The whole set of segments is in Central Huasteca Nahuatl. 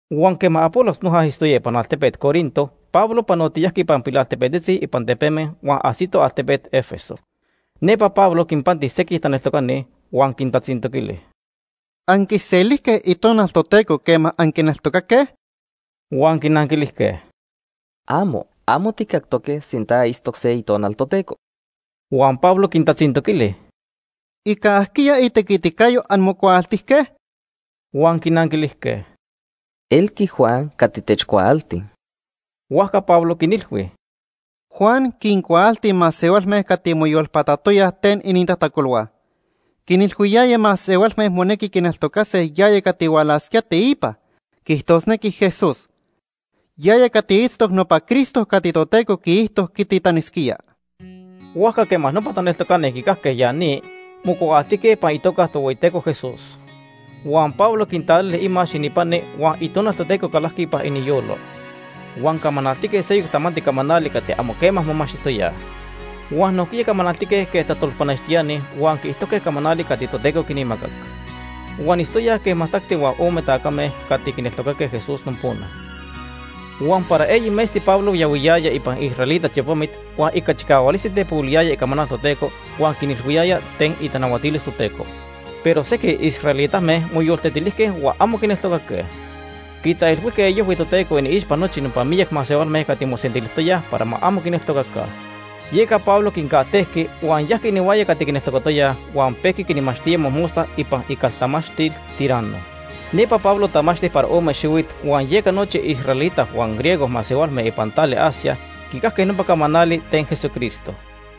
Huan quema Apolos noja itztoya ipan altepet Corinto, Pablo panotiyajqui ipan pilaltepetzitzi ipan tepeme huan ajsito altepet Éfeso. Nepa Pablo quinpanti sequij taneltocani, huan quintatzintoquili: ―¿Anquiselijque Itonal Toteco quema anquineltocaque? Huan quinanquilijque: ―¡Amo! Amo tijcactoque sinta itztoc se Itonal Toteco. Huan Pablo quintatzintoquili: ―¿Ica ajquiya itequiticayo anmocuaaltijque? Huan quinanquilijque: ―Elqui Juan cati techcuaalti. Huajca Pablo quinilhui: ―Juan quincuaalti masehualme cati moyolpatatoyaj ten inintajtacolhua. Quinilhuiyaya masehualme monequi quineltocase yaya cati hualasquía teipa, quiijtosnequi Jesús. Yaya cati itztoc nopa Cristo cati Toteco quiijto quititanisquía. Huajca quema nopa taneltocani quicajque ya ni, mocuaaltijque ipan itoca Ica itequiticayo. Tohueyiteco Jesús. Huan Pablo quintalili imax ininpani huan Itonal Toteco calajqui ipan iniyolo. Huan camanaltique seyoc tamanti camanali cati amo quema momachtijtoyaj. Huan nojquiya camanaltique quej tajtolpanextiani huan quiijtojque camanali cati Toteco quinmacac. Huan itztoyaj quej majtacti huan ome tacame cati quineltocaque Jesús nopona. Huan para eyi metzti Pablo yahuiyaya ipan israelita tiopamit huan ica chicahualisti tepohuiliyaya icamanal Toteco huan quinilhuiyaya ten itanahuatilis Toteco. Pero sequij israelitame moyoltetilijque huan amo quineltocaque. Quitaijilhuijque iojhui Toteco iniixpa nochi nopa miyac masehualme cati mosentilijtoyaj para ma amo quineltocaca. Yeca Pablo quincajtejqui huan yajqui inihuaya cati quineltocatoyaj huan pejqui quinmachtía mojmosta ipan icaltamachtil Tiranno. Nepa Pablo tamachti para ome xihuit huan yeca nochi israelita huan griego masehualme ipan tali Asia quicajque nopa camanali ten Jesucristo.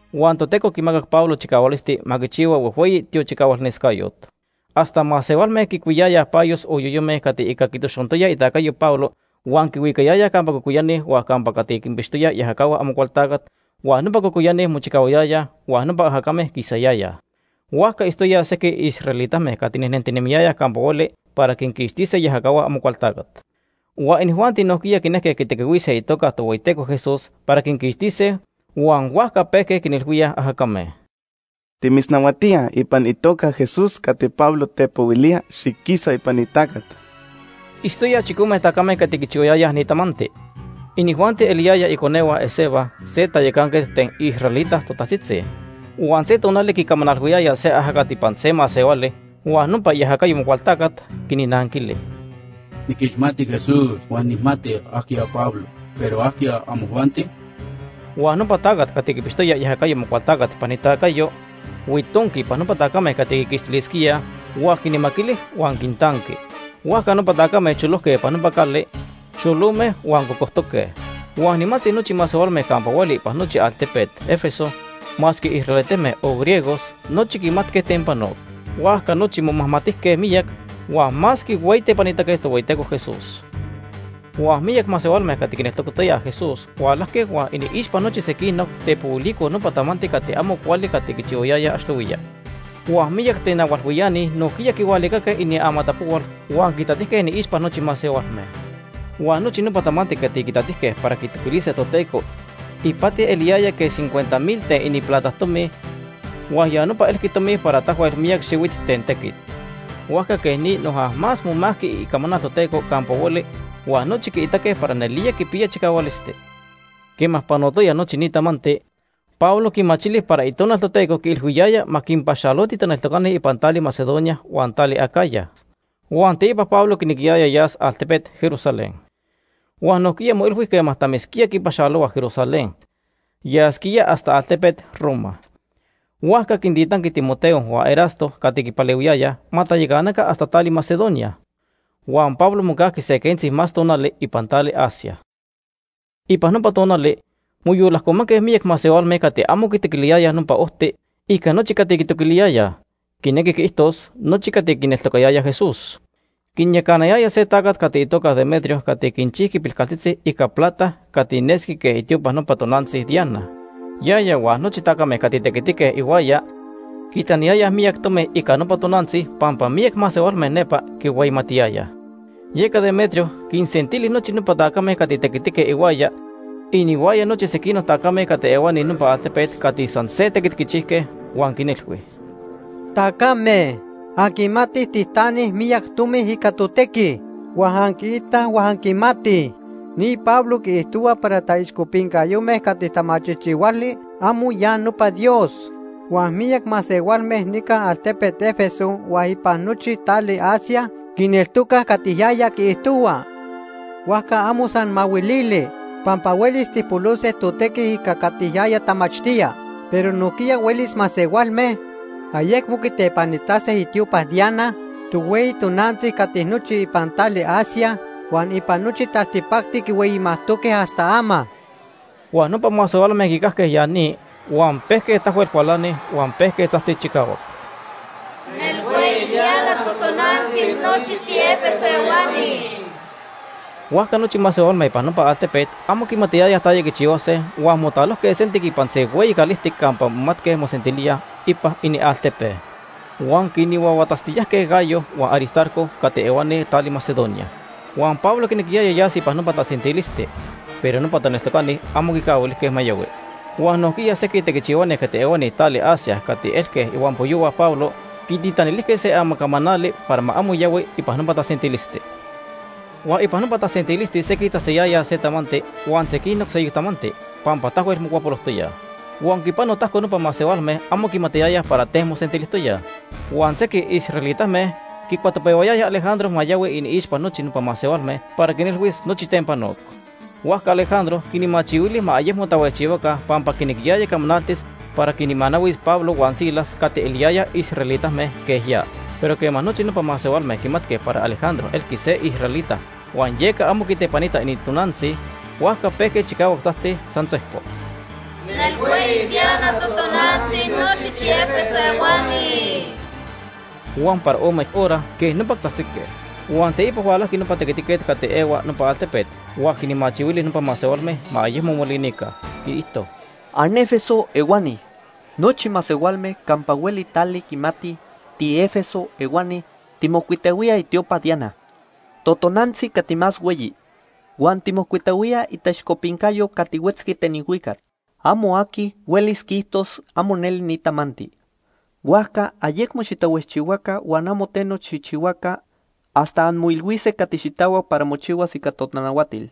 Huan Toteco quimacac Pablo chicahualisti ma quichihua huejhueyi tiochicahualnescayot. Hasta masehualme quicuiyayaj payos o yoyome cati ica quitoxontoya itacayo Pablo huan quihuicayayaj campa cocoyani huan campa cati quinpixtoyaj iajacahua Amocualtacat huan nopa cocoyani mochicahuayayaj huan nopa ajacame quisayayaj. Huajca itztoyaj sequij israelitame cati nejnentinemiyayaj campa hueli para quinquixtise iajacahua Amocualtacat. Huan inijuanti nojquiya quinejque quitequihuise itoca Tohueyiteco Jesús para quinquixtise huan huajca pejque quinilhuíaj ajacame: “Timitznahuatíaj ipan itoca Ica itequiticayo. Jesús cati Pablo tepohuilía, xiquisa ipan ni tacat.” Itztoyaj chicome tacame cati quichihuayayaj ni tamanti. Inijuanti eliyayaj iconehua Esceva, se tayacanquet ten israelita totajtzitzi. Huan se tonali quicamanalhuiyayaj se ajacat ipan se masehuali huan nopa iajacayo Amocualtacat quinnanquili: “Niquixmati Jesús huan nijmati ajquiya Pablo, pero ¿ajquiya amojuanti?” Huan nopa tacat cati quipixtoya iajacayo Amocualtacat ipan itacayo, huitonqui ipan nopa tacame cati quiquixtilisquíaj huan quinmaquili huan quintanqui. Huajca nopa tacame cholojque ipan nopa cali, xolome huan cocojtoque. Huan nimantzi nochi masehualme campa hueli ipan nochi altepet Éfeso, masque israelitame o griegos, nochi quimatque ten panoc. Huajca nochi momajmatijque miyac huan más quihueyitepanitaque Tohueyiteco Jesús Itoca Tohueyiteco Jesús.. Huan miyac masehualme cati quineltocatoyaj Jesús hualajque huan iniixpa nochi sequinoc, tepohuilicoj nopa tamanti cati amo cuali cati quichihuayayaj achtohuiya. Huan miyac tenahualhuiani nojquiya quihualicaque iniamatapohual huan quitatijque iniixpa nochi masehualme. Huan nochi nopa tamanti cati quitatijque para quitoquilise Toteco ipati eliyaya quej cincuenta mil ten ininplata tomi huan ya nopa elqui tomi para tahuel miyac xihuit ten tequit. Huajca quej ni noja más momajqui icamanal Toteco campa hueli huan nochi quiitaque para nelía quipiya chicahualisti. Quema panotoya nochi ni tamanti, Pablo quimachili para Itonal Toteco quiilhuiyaya ma quinpaxaloti taneltocani ipan tali Macedonia huan tali Acaya. Huan teipa Pablo quinequiyaya yas altepet Jerusalén. Huan nojquiya moilhui quema tamisquía quipaxalohua Jerusalén, yasquía hasta altepet Roma. Huajca quintitanqui Timoteo huan Erasto cati quipalehuiyayaj ma tayacanaca hasta tali Macedonia. Huan Pablo mocajqui se quentzi más tonali ipan tali Asia. Ipan nopa tonali moyolajcomanque miyac masehualme cati amo quitoquiliyayaj Nopa Ojti ica nochi cati quitoquiliyayaj, quinequi quiijtos, nochi cati quineltocayayaj Jesús. Quinyacanayaya se tacat cati itoca Demetrio cati quinchijqui pilcaltzitzi ica plata cati nesqui quej itiopa nopa tonantzi Diana. Yaya huan nochi tacame cati tequitique ihuaya quitaniyayaj miyac tomi ica nopa tonantzi pampa miyac masehualme nepa quihueyimatiyayaj. Yeca Demetrio quinsentili nochi nopa tacame cati tequitique ihuaya, inihuaya nochi sequinoc tacame cati ehuani nopa altepet cati san se tequit quichijque huan quinilhui: “Tacame, anquimatij tijtanij miyac tomi ica totequi. Huan anquiitaj huan anquimatij ni Pablo quiijtohua para taixcopincayome cati tamachijchihuali amo ya nopa dios. Huan miyac masehualme nica altepet Éfeso huan ipan nochi tali Asia quineltocaj cati yaya quiijtohua. Huajca amo san mahuilili pampa huelis tijpolose totequi ica cati yaya tamachtía, pero nojquiya huelis masehualme ayecmo quitepanitase itiopa Diana, tohueyi tonantzi cati nochi ipan tali Asia huan ipan nochi taltipacti quihueyimajtoque hasta ama.” Huan nopa masehualme quicajque ya ni, huan pejque tahuel cualanij, huan pejque tzajtzij chicahuac: “¡Nelhueyi Diana totonantzi nochi tiÉfeso ehuani!” Huajca nochi masehualme ipan nopa altepet amo quimatiyayaj taya quichihuase huan motalojque sentic ipan se hueyi calijtic campa momatque mosentilíaj ipan inialtepe. Huan quinhuahuatatztiyajque Gayo huan Aristarco cati ehuani tali Macedonia. Huan Pablo quinequiyaya yas ipan nopa tasentilisti, pero nopa taneltocani amo quicahuilijque ma yahui. Huan nojquiya sequij tequichihuani cati ehuani tali Asia cati elque ihuampoyohua Pablo quititanilijque se amacamanali para ma amo yahui ipan nopa tasentilisti. Huan ipan nopa tasentilisti sequij tzajtziyayaj se tamanti huan sequinoc seyoc tamanti, pampa tahuel mocuapolojtoyaj. Huan quipano tajco nopa masehualme amo quimatiyayaj para ten mosentilijtoyaj. Huan sequij israelitame quicuatopehuayayaj Alejandro ma yahui iniixpa nochi nopa masehualme para quinilhuis nochi ten panoc. Huajca Alejandro quinmachihuili ma ayecmo tahuejchihuaca pampa quinequiyaya camanaltis para quinmanahuis Pablo huan Silas cati eliyayaj israelitame quej ya. Pero quema nochi nopa masehualme quimatque para Alejandro elqui se israelita huan yeca amo quitepanita inintonantzi, huajca pejque chicahuac tzajtzij san sejco: “¡Nelhueyi Diana totonantzi nochi tiÉfeso ehuani!” Huan para ome horas quej nopa tahuejchijque. Huan teipa hualajqui nopa tequitiquet cati ehuani nopa altepet huan quinmachihuili nopa masehualme ma ayecmo molinica. Quiijto: “¡AnÉfeso ehuani! Nochi masehualme campa hueli tali quimatij tiÉfeso ehuani tijmocuitahuíaj itiopa Diana, totonantzi cati más hueyi, huan tijmocuitahuíaj itaixcopincayo cati huetzqui ten ilhuicac. Amo aqui huelis quiijtos amo neli ni tamanti; huajca ayecmo xitahuejchihuaca huan amo teno xijchihuaca hasta anmoilhuise cati xitahuac para mochihuas ica totanahuatil.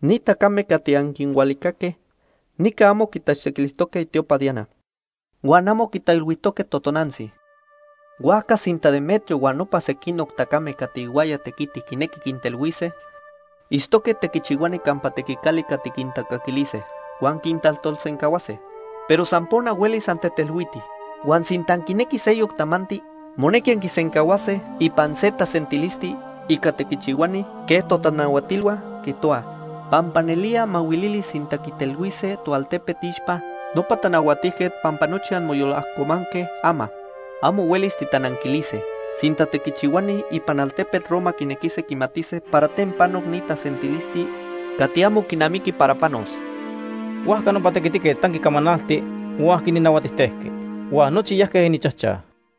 Ni tacame cati anquinhualicaque nica amo quitachtequilijtoque itiopa Diana huan amo quitaijilhuijtoque totonantzi. Huajca sinta Demetrio huan nopa sequinoc tacame cati ihuaya tequitij quinequij quintelhuise, itztoque tequichihuani campa tequicali cati quintacaquilise huan quintajtolsencahuase, pero san nopona huelis antetelhuitij. Huan sinta anquinequij seyoc tamanti, monequi anquisencahuase ipan se tasentilisti ica tequichihuani quej totanahuatilhua quiijtohuaj. Pampa nelía mahuilili sinta quitelhuise toaltepe iixpa nopa tanahuatijquet pampa nochi anmoyolajcomanque ama. Amo huelis titananquilise sinta tequichihuani ipan altepet Roma quinequise quimatise para ten panoc ni tasentilisti cati amo quinamiqui para panos.” Huajca nopa tequitiquet tanqui camanalti huan quinnahuatijtejqui. Huan nochi yajque ininchajchaj.